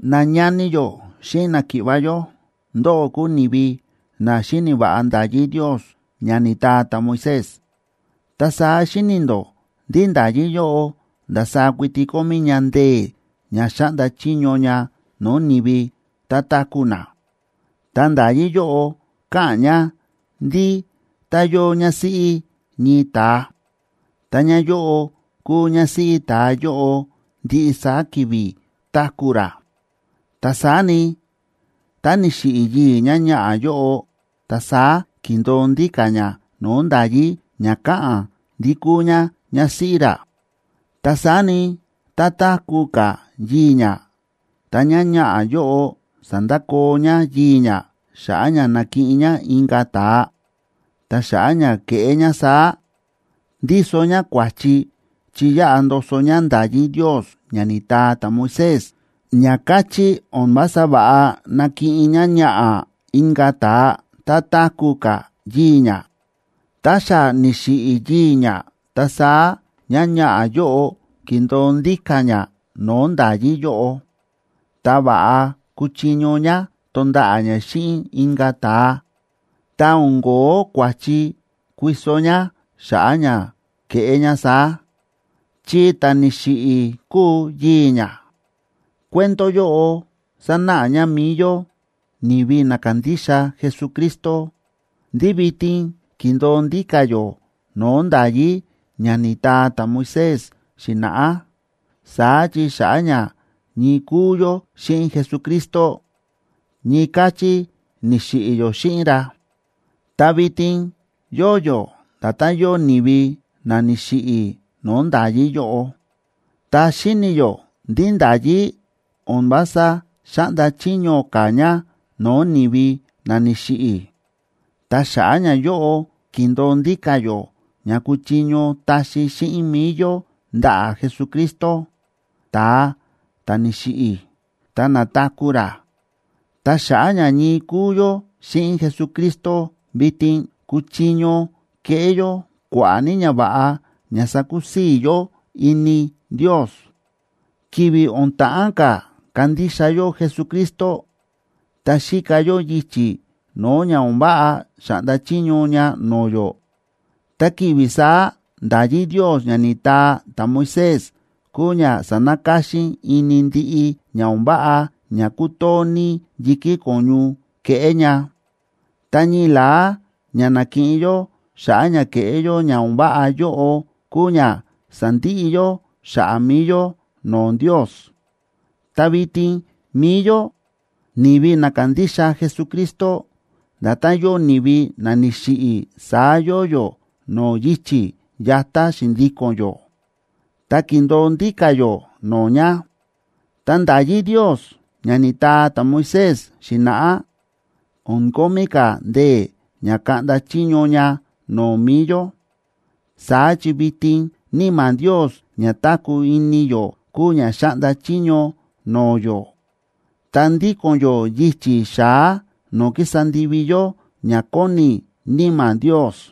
Nañani yó xíꞌin náki̱ꞌva̱ yó, ndóꞌó kúu ni̱vi na xíni̱ va̱ꞌa nda̱yí Ndios ña ni̱taa ta̱Moisés. Ta saá xíni̱ ndó ndí nda̱yí yóꞌo ndasaá kuiti kómí ña ndee̱ ña xáꞌnda chiño ña no̱o̱ ni̱vi tá táku̱ na. Ta nda̱yí yóꞌo káꞌa̱n ña ndí tá yóo ñásíꞌí ñii ta̱a, ta ñáyóꞌo kúu ñásíꞌí ta̱a yóꞌo ndiꞌi saá ki̱vi̱ táku̱ ra. Ta saá ni, tá ni̱xiꞌi̱ yii̱ ñáñaꞌa̱ yóꞌo, ta saá kindo̱o ndíka̱ ñá no̱o̱ nda̱yí ña káꞌa̱n ndí kúu ñá ñásíꞌí ra. Ta saá ni, tá táku̱ ka̱ yii̱ ñá, ta ñáñaꞌa̱ yóꞌo sándakoo ñá yii̱ ñá xa̱ꞌa̱ ña nakiꞌin ñá inka̱ ta̱a, ta xa̱ꞌa̱ ña kéꞌé ñá saá, ndíso ñá kua̱chi chi yáꞌa ndoso ñá nda̱yí Ndios ña ni̱taa ta̱Moisés ña káchí o̱n vása va̱ꞌa nakiꞌin ñáñaꞌa̱ inka̱ ta̱a tá táku̱ ka̱ yii̱ ñá. Tá xa ni̱xiꞌi̱ yii̱ ñá, ta saá ñáñaꞌa̱ yóꞌo kindo̱o ndíka̱ ñá no̱o̱ nda̱yí yóꞌo, ta va̱ꞌa kuchiño ñá tonda̱ꞌa̱ ñá xíꞌin inka̱ ta̱a, ta o̱n kóo kua̱chi kuiso ñá xa̱ꞌa̱ ña keꞌé ñá saá, chi ta̱ ni̱xiꞌi̱ kúu yii̱ ñá. Cuento yóꞌo sánáꞌa ña mi̱i yó, ni̱vi na kándixa Jesucristo, ndí vitin kíndo̱o ndíka̱ yó no̱o̱ nda̱yí ña ni̱taa ta̱Moisés xi̱na̱ꞌá. Saá chi xa̱ꞌa̱ ña ñii kúu yó xíꞌin Jesucristo, ñii káchí ni̱xiꞌi̱ yó xíꞌin ra, ta vitin yóo yó nda̱tán yóo ni̱vi na ni̱xiꞌi̱ no̱o̱ nda̱yí yóꞌo, ta xíni̱ yó ndí nda̱yí o̱n vása xáꞌnda chiño ka̱ ña no̱o̱ ni̱vi na ni̱xiꞌi̱. Ta xa̱ꞌa̱ ñayóꞌo kíndo̱o ndíka̱ yó ña kuchiño taxi xíꞌin mi̱i yó ndaꞌa̱ Jesucristo, ta̱a ta̱ ni̱xiꞌi̱, ta na̱taku̱ ra. Ta xa̱ꞌa̱ ña ñii kúu yó xíꞌin Jesucristo vitin, kúchiño keꞌé yó kua̱ꞌa̱ ní ñava̱ꞌa ña sakusii̱ yó ini Ndios. Ki̱vi̱ o̱n ta̱ꞌán ka̱ kandixa yó Jesucristo, ta xíka yó yichi̱ no̱o̱ ña o̱n váꞌa xáꞌnda chiño ña no̱o̱ yó. Ta ki̱vi̱ saá nda̱yí Ndios ña ni̱taa ta̱Moisés kúu ña sa̱nakáxín ini ndiꞌi ña o̱n váꞌa ña kútoo ní yi̱kí ko̱ñu keꞌé ña. Ta ñii la̱á ña na̱kiꞌin yó xa̱ꞌa̱ ña kéꞌé yó ña o̱n váꞌa yóꞌo kúu ña sándiꞌi yó xa̱ꞌa̱ mi̱i yó no̱o̱ Ndios. Ta vitin mi̱i yó, ni̱vi na kándixa Jesucristo, nda̱tán yóo ni̱vi na ni̱xiꞌi̱, saá yóo yó no̱o̱ yichi̱ yatá xi̱ndíko̱n yó, ta kíndo̱o ndíka̱ yó no̱o̱ ña. Ta nda̱yí Ndios ña ni̱taa ta̱Moisés xi̱na̱ꞌá o̱n kómí ka̱ ndee̱ ña kaꞌnda chiño ña no̱o̱ mi̱i yó. Saá chi vitin Níma̱ Ndios ña táku̱ ini yó kúu ña xáꞌnda chiño no̱o̱ yó, ta ndíko̱n yó yichi̱ xa̱á no̱o̱ kísa ndivi yó ña kóni Níma̱ Ndios.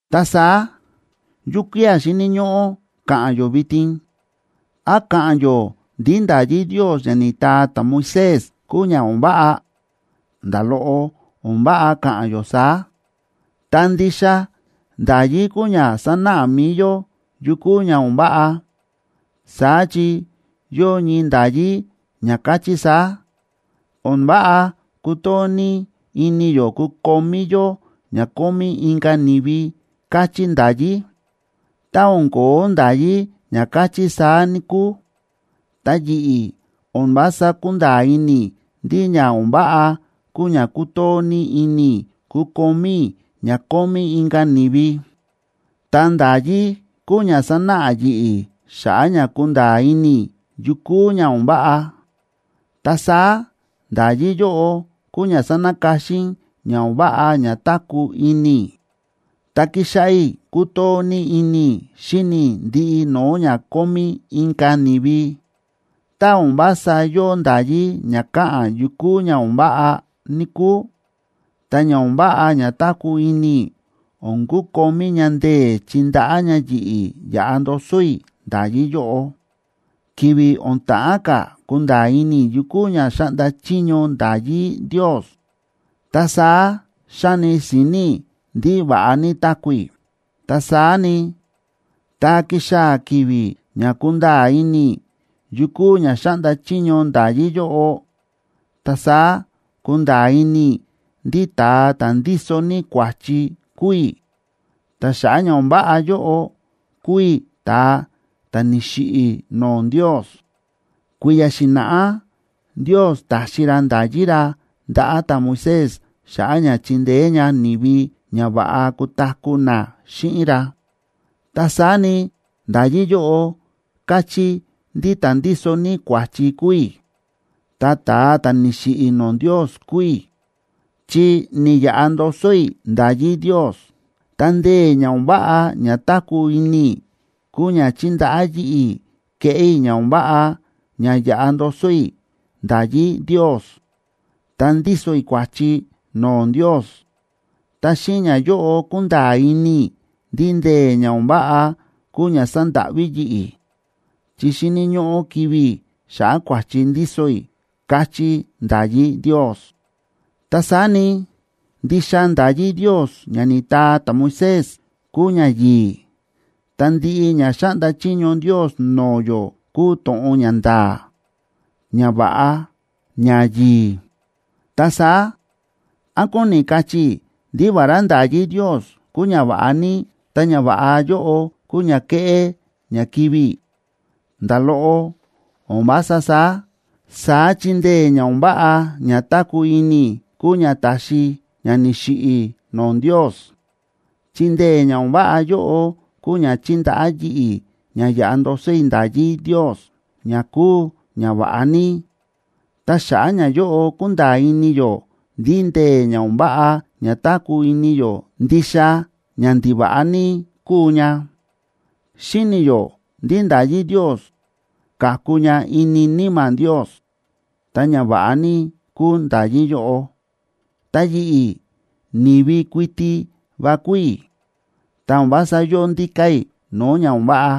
Ta saá, ¿yukía̱ xíni̱ ñóꞌó ka̱ꞌa̱n yó vitin? ¿Án ka̱ꞌa̱n yó ndí nda̱yí Ndios ña ni̱taa ta̱Moisés kúu ña o̱n váꞌa? ¡Nda̱ loꞌo o̱n váꞌa ka̱ꞌa̱n yó saá! Ta ndixa nda̱yí kúu ña sánáꞌa mi̱i yó yu kúu ña o̱n váꞌa. Saá chi yóo ñii nda̱yí ña káchí saá: “O̱n váꞌa kutoo ní ini yó kukomí yó ña kómí inka̱ ni̱vi”, káchí nda̱yí. Tá o̱n ko̱ó nda̱yí ña káchí saá, níkúu, ta yi̱ꞌi̱ o̱n vása kúnda̱a̱ ini i̱ ndí ña o̱n váꞌa kúu ña kútoo ní ini i̱ kukomí i̱ ña kómí inka̱ ni̱vi. Ta nda̱yí kúu ña sánáꞌa yi̱ꞌi̱ xa̱ꞌa̱ ña kunda̱a̱ ini i̱ yu kúu ña o̱n váꞌa. Ta saá nda̱yí yóꞌo kúu ña sa̱nakáxín ña o̱n váꞌa ña táku̱ ini i̱, ta ki̱xáꞌá i̱ kútoo ní ini i̱ xíni i̱ ndiꞌi no̱o̱ ña kómí inka̱ ni̱vi. Tá o̱n vása yóo nda̱yí ña káꞌa̱n yu kúu ña o̱n váꞌa, níkúu, ta ña o̱n váꞌa ña táku̱ ini i̱ o̱n kukomí ña ndee̱ chindaꞌá ña yi̱ꞌi̱ yaꞌa ndoso i̱ nda̱yí yóꞌo. Ki̱vi̱ o̱n ta̱ꞌán ka̱ kunda̱a̱ ini i̱ yu kúu ña xáꞌnda chiño nda̱yí Ndios, ta saá xa̱ni si̱ni̱ i̱ ndí va̱ꞌa ní táku̱ i̱. Ta saá ni, tá ki̱xaa̱ ki̱vi̱ ña kúnda̱a̱ ini i̱ yu kúu ña xáꞌnda chiño nda̱yí yóꞌo, ta saá ku̱nda̱a̱ ini i̱ ndí ta̱a ta̱ ndíso ní kua̱chi kúu i̱, ta xa̱ꞌa̱ ña o̱n váꞌa yóꞌo, kúu i̱ ta̱a ta̱ ni̱xiꞌi̱ no̱o̱ Ndios. Kui̱ya̱ xi̱na̱ꞌá Ndios ta̱xi ra nda̱yí ra ndaꞌa̱ ta̱Moisés xa̱ꞌa̱ ña chindeé ña ni̱vi ña va̱ꞌa kutaku̱ na xíꞌin ra. Ta saá ni, nda̱yí yóꞌo káchí ndí ta̱ ndíso ní kua̱chi kúu i̱, ta ta̱a ta̱ ni̱xiꞌi̱ no̱o̱ Ndios kúu i̱, chi ni̱yaꞌa ndoso i̱ nda̱yí Ndios. Ta ndee̱ ña o̱n váꞌa ña táku̱ ini i̱ kúu ña chi̱ndaꞌá yi̱ꞌi̱ kéꞌé i̱ ña o̱n váꞌa ña yáꞌa ndoso i̱ nda̱yí Ndios, ta ndíso i̱ kua̱chi no̱o̱ Ndios. Ta xíꞌin ñayóꞌo kúnda̱a̱ ini i̱ ndí ndee̱ ña o̱n váꞌa kúu ña sa̱ndáꞌví yi̱ꞌi̱, chi xíni̱ ñóꞌó kivi̱ i̱ xa̱ꞌa̱ kua̱chi ndíso i̱, káchí nda̱yí Ndios. Ta saá ni, ndixa nda̱yí Ndios ña ni̱taa ta̱Moisés kúu ñayi̱i̱, ta ndiꞌi ña xáꞌnda chiño Ndios no̱o̱ yó kúu to̱ꞌon ñanda̱a̱, ñava̱ꞌa, ñayi̱i̱. Ta saá, ¿án kóni kachí i̱ ndí vará nda̱yí Ndios kúu ñava̱ꞌa ní, ta ñava̱ꞌa yóꞌo kúu ña keꞌé ña kivi̱ i̱? ¡Nda̱ loꞌo, o̱n vása saá! Saá chi ndee̱ ña o̱n váꞌa ña táku̱ ini i̱ kúu ña ta̱xi ña ni̱xiꞌi̱ i̱ no̱o̱ Ndios. Chi ndee̱ ña o̱n váꞌa yóꞌo kúu ña chi̱ndaꞌá yi̱ꞌi̱ ña yaꞌa ndoso i̱ nda̱yí Ndios ña kúu ñava̱ꞌa ní. Ta xa̱ꞌa̱ ñayóꞌo ku̱nda̱a̱ ini yó ndí ndee̱ ña o̱n váꞌa ña táku̱ ini yó ndixa ña ndiva̱ꞌa ní kúu ña. Xíni̱ yó ndí nda̱yí Ndios ka̱ku ña ini Níma̱ Ndios, ta ñava̱ꞌa ní kúu nda̱yí yóꞌo. Ta yi̱ꞌi̱, ni̱vi kuiti va kúu i̱, ta o̱n vása yóo ndíka̱ i̱ no̱o̱ ña o̱n váꞌa,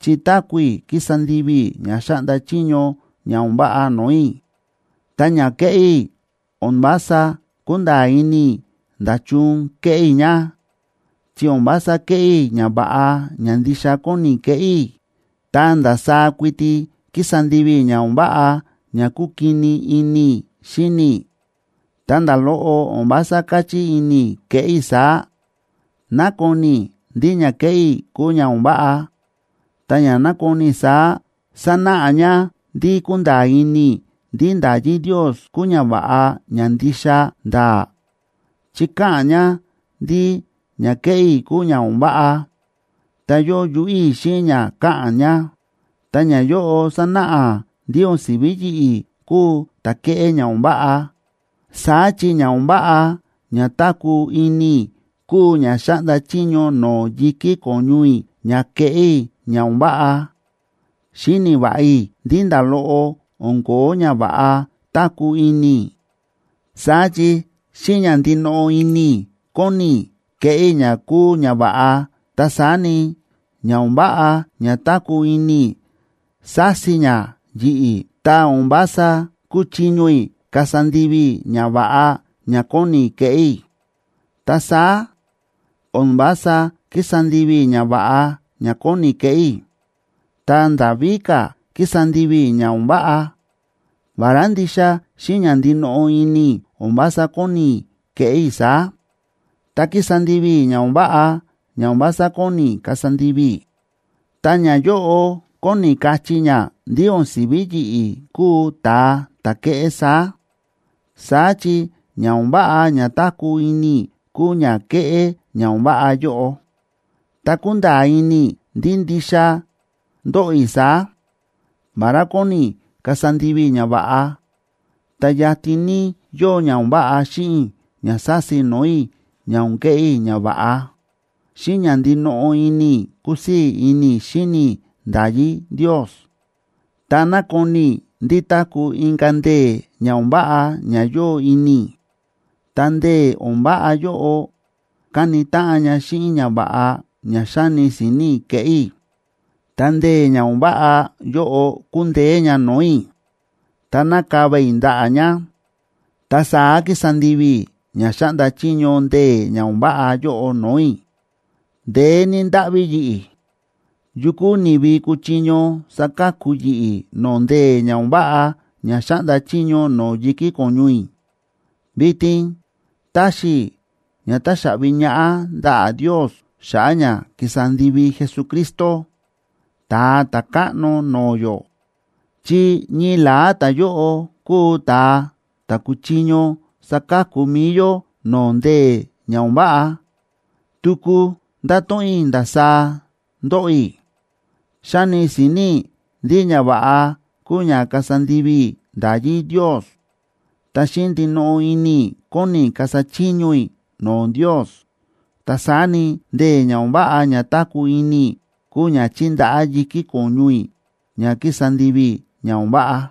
chi táku̱ i̱ kísa ndivi i̱ ña xáꞌnda chiño ña o̱n váꞌa no̱o̱ i̱. Ta ña kéꞌé i̱, o̱n vása kúnda̱a̱ ini i̱ nda̱chun kéꞌé i̱ ña. Chi o̱n vása kéꞌé i̱ ñava̱ꞌa ña ndixa kóni keꞌé i̱, ta ndasaá kuiti kísa ndivi i̱ ña o̱n váꞌa, ña kúkini ini i̱ xíni i̱. Ta nda̱ loꞌo o̱n vása káchí ini i̱ keꞌé i̱ saá. Nákoni i̱ ndí ña kéꞌé i̱ kúu ña o̱n váꞌa, ta ña nákoni i̱ saá, sánáꞌa ña ndí kúnda̱a̱ ini i̱ ndí nda̱yí Ndios kúu ñava̱ꞌa ña ndixa nda̱a̱, chi káꞌa̱n ña ndí ña kéꞌé i̱ kúu ña o̱n váꞌa, ta yóo yuꞌú i̱ xíꞌin ña káꞌa̱n ña. Ta ñayóꞌo sánáꞌa ndí o̱n si̱ví yi̱ꞌi̱ kúu ta̱ kéꞌé ña o̱n váꞌa, saá chi ña o̱n váꞌa ña táku̱ ini i̱ kúu ña xáꞌnda chiño no̱o̱ yi̱kí ko̱ñu i̱ ña keꞌé i̱ ña o̱n váꞌa. Xíni̱ va̱ꞌa i̱ ndí nda̱ loꞌo o̱n ko̱ó ñava̱ꞌa táku̱ ini i̱. Saá chi xíꞌin ña ndinoꞌo ini i̱ kóni ní i̱ keꞌé i̱ ña kúu ñava̱ꞌa, ta saá ni, ña o̱n váꞌa ña táku̱ ini i̱, sási ña yi̱ꞌi̱, ta o̱n vása kúchiño i̱ kasa ndivi i̱ ñava̱ꞌa ña kóni i̱ keꞌé i̱. Ta saá o̱n vása kísa ndivi i̱ ñava̱ꞌa ña kóni keꞌé i̱, ta nda̱ víka̱ kísa ndivi i̱ ña o̱n váꞌa, vará ndixa xíꞌin ña ndinoꞌo ini i̱ o̱n vása kóni i̱ keꞌé i̱ saá. Tá kísa ndivi i̱ ña o̱n váꞌa ña o̱n vása kóni i̱ kasa ndivi i̱, ta ñayóꞌo kóni kachí ña ndí o̱n si̱ví yi̱ꞌi̱ kúu ta̱a ta̱ kéꞌé saá. Saá chi ña o̱n váꞌa ña táku̱ ini i̱ kúu ña kéꞌé ña o̱n váꞌa yóꞌo. Ta kúnda̱a̱ ini i̱ ndí ndixa ndóꞌo i̱ saá: Vará kóni i̱ kasa ndivi i̱ ñava̱ꞌa, ta yatin ní yóo ña o̱n váꞌa xíꞌin i̱ ña sási no̱o̱ i̱ ña o̱n keꞌé i̱ ñava̱ꞌa. Xíꞌin ña ndinoꞌo ini i̱ kúsii̱ ini i̱ xíni i̱ nda̱yí Ndios, ta nákoni i̱ ndí táku̱ inka̱ ndee̱ ña o̱n váꞌa ña yóo ini i̱, ta ndee̱ o̱n váꞌa yóꞌo káni táꞌan ña xíꞌin ñava̱ꞌa ña xáni si̱ni̱ i̱ keꞌé i̱. Ta ndee̱ ña o̱n váꞌa yóꞌo kúndeé ña no̱o̱ i̱, ta nákava i̱ ndaꞌa̱ ña. Ta saá kísa ndivi i̱ ña xáꞌnda chiño ndee̱ ña o̱n váꞌa yóꞌo no̱o̱ i̱. ¡Ndeé ní ndáꞌví yi̱ꞌi̱! ¿Yu kúu ni̱vi kuchiño saka̱ku yi̱ꞌi̱ no̱o̱ ndee̱ ña o̱n váꞌa ña xáꞌnda chiño no̱o̱ yi̱kí ko̱ñu i̱? ¡Vitin taxi i̱ ña taxaꞌvi ñaꞌá ndaꞌa̱ Ndios xa̱ꞌa̱ ña ki̱sa ndivi Jesucristo, Ta̱a Ta̱káꞌno no̱o̱ yó!, chi ñii la̱á ta̱yóꞌo kúu ta̱a ta̱ kúchiño saka̱ku mi̱i yó no̱o̱ ndee̱ ña o̱n váꞌa. Tuku ndato̱ꞌon i̱ ndasaá ndóꞌo i̱: Xáni si̱ni̱ i̱ ndí ñava̱ꞌa kúu ña kasa ndivi i̱ nda̱yí Ndios, ta xíꞌin ndinoꞌo ini i̱ kóni i̱ kasa chiño i̱ no̱o̱ Ndios. Ta saá ni, ndee̱ ña o̱n váꞌa ña táku̱ ini i̱ kúu ña chíndaꞌá yi̱kí ko̱ñu i̱ ña kísa ndivi i̱ ña o̱n váꞌa.